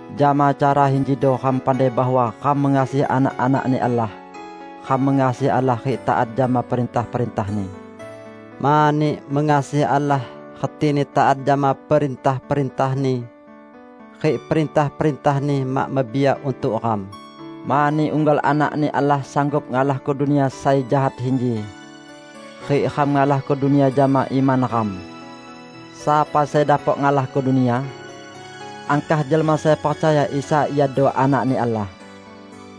Jama cara injido ram pandai bahwa ram mengasihi anak-anak-Ni Allah: Ram mengasihi Allah rik taat jama perintah-perintah-Ni. Mani, mengasihi Allah retini taat jama perintah-perintah-Ni. Rik perintah-perintah-Ni mak mebiak untuk ram, mani unggal anak-Ni Allah sanggup ngalahko dunia sai jahat inji. Rik ram ngalahko dunia jama iman ram. Sapa sai dapok ngalahko dunia? Angkah jelma sai percaya Isa iado Anak-Ni Allah.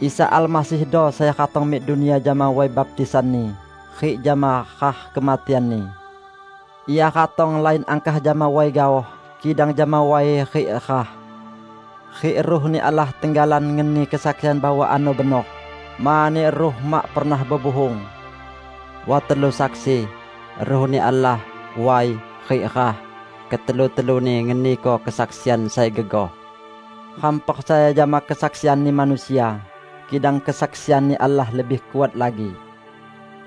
Isa Almasihdo sai ratong mik dunia jama way baptisan-Ni rik jama rah kematian-Ni. Ia ratong lain angkah jama way gaoh, kidang jama way rik rah. Rik Ruh-Ni Allah tenggalan ngeni kesaksian bahwa ano benor, mani Ruh mak pernah bebuhung. Wat telu saksi: Ruh-Ni Allah, way rik rah -- ketelu-teluni ngeniko kesaksian sai gegoh. Ram percaya jama kesaksianni manusia, kidang kesaksian-Ni Allah lebih kuat lagi.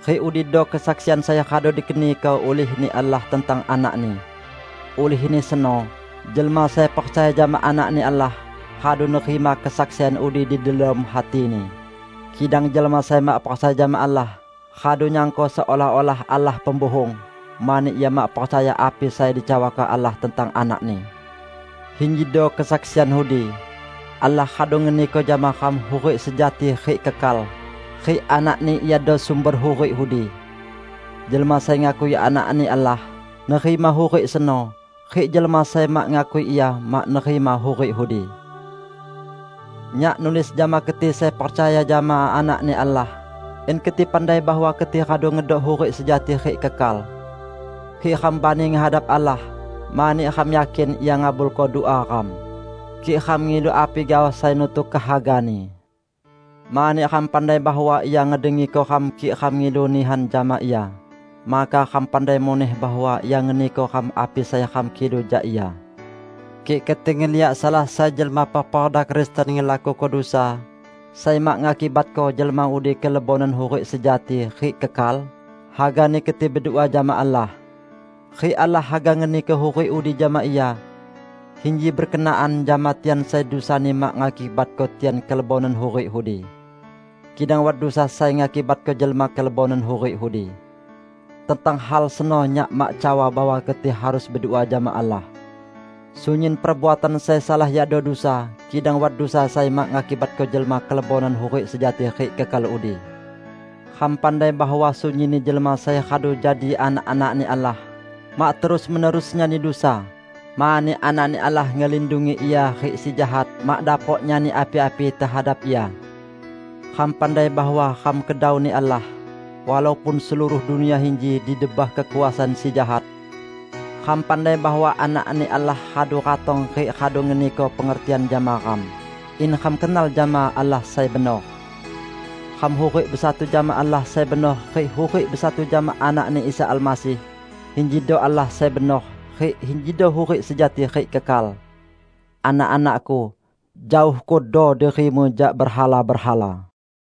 Rik udido kesaksian sai radu dikeniko ulih-Ni Allah tentang Anak-Ni. Ulihni seno, jelma sai percaya jama Anak-Ni Allah, radu nerima kesaksian udi di delom hatini; kidang jelma sai mak percaya jama Allah, radu nyangko seolah-olah Allah pembuhung, mani ia mak percaya api sai dicawako Allah tentang Anak-Ni. Injido kesaksian udi: Allah radu ngeniko jama ram hurik sejati rik kekal, rik Anak-Ni iado sumber hurik udi. Jelma sai ngakui Anak-Ni Allah, nerima hurik seno; rik jelma sai mak ngakui Ia, mak nerima hurik udi. Nyak nulis jama keti sai percaya jama Anak-Ni Allah, in keti pandai bahwa keti radu ngedok hurik sejati rik kekal. Rik ram bani ngehadap Allah, mani ram yakin Ia ngabulko dua ram, kik ram ngilu api gaoh sai nutuk kehaga-Ni. Mani ram pandai bahwa Ia ngedengiko ram kik ram ngilu nihan jama Ia, maka ram pandai muneh bahwa Ia ngeniko ram api sai ram kilu jak Ia. Kik keti ngeliak salah sai jelma peperda Kristen ngelakuko dusa sai mak ngakibatko jelma udi kelebonan hurik sejati rik kekal, hagani keti bedua jama Allah; rik Allah haga ngeniko hurik udi jama ia. Inji berkenaan jama tian sai dusani mak ngakibatko tian kelebonan hurik udi. Kidang wat dusa sai ngakibatko jelma kelebonan hurik udi. Tentang hal seno nyak mak cawa bahwa keti harus bedua jama Allah. Sunyin perbuatan sai salah yakdo dusa, kidang wat dusa sai mak ngakibatko jelma kelebonan hurik sejati rik kekal udi. Ram pandai bahwa sunyinni jelma sai radu jadi anak-anak-Ni Allah, mak terus-menerus nyani dusa, mani Anak-Ni Allah ngelindungi ia rik Si Jahat mak dapok nyani api-api tehadap ia. Ram pandai bahwa ram kedau-Ni Allah, walaupun seluruh dunia inji di debah kekuasaan Si Jahat. Ram pandai bahwa Anak-Ni Allah radu ratong rik radu ngeniko pengertian jama ram, in ram kenal jama Allah sai benor. Ram hurik besatu jama Allah sai benor rik hurik besatu jama Anak-Ni Isa Almasih. Injido Allah sai benor, rik injido hurik sejati rik kekal. Anak-anakku, jaohkodo dirimu jak berhala-berhala!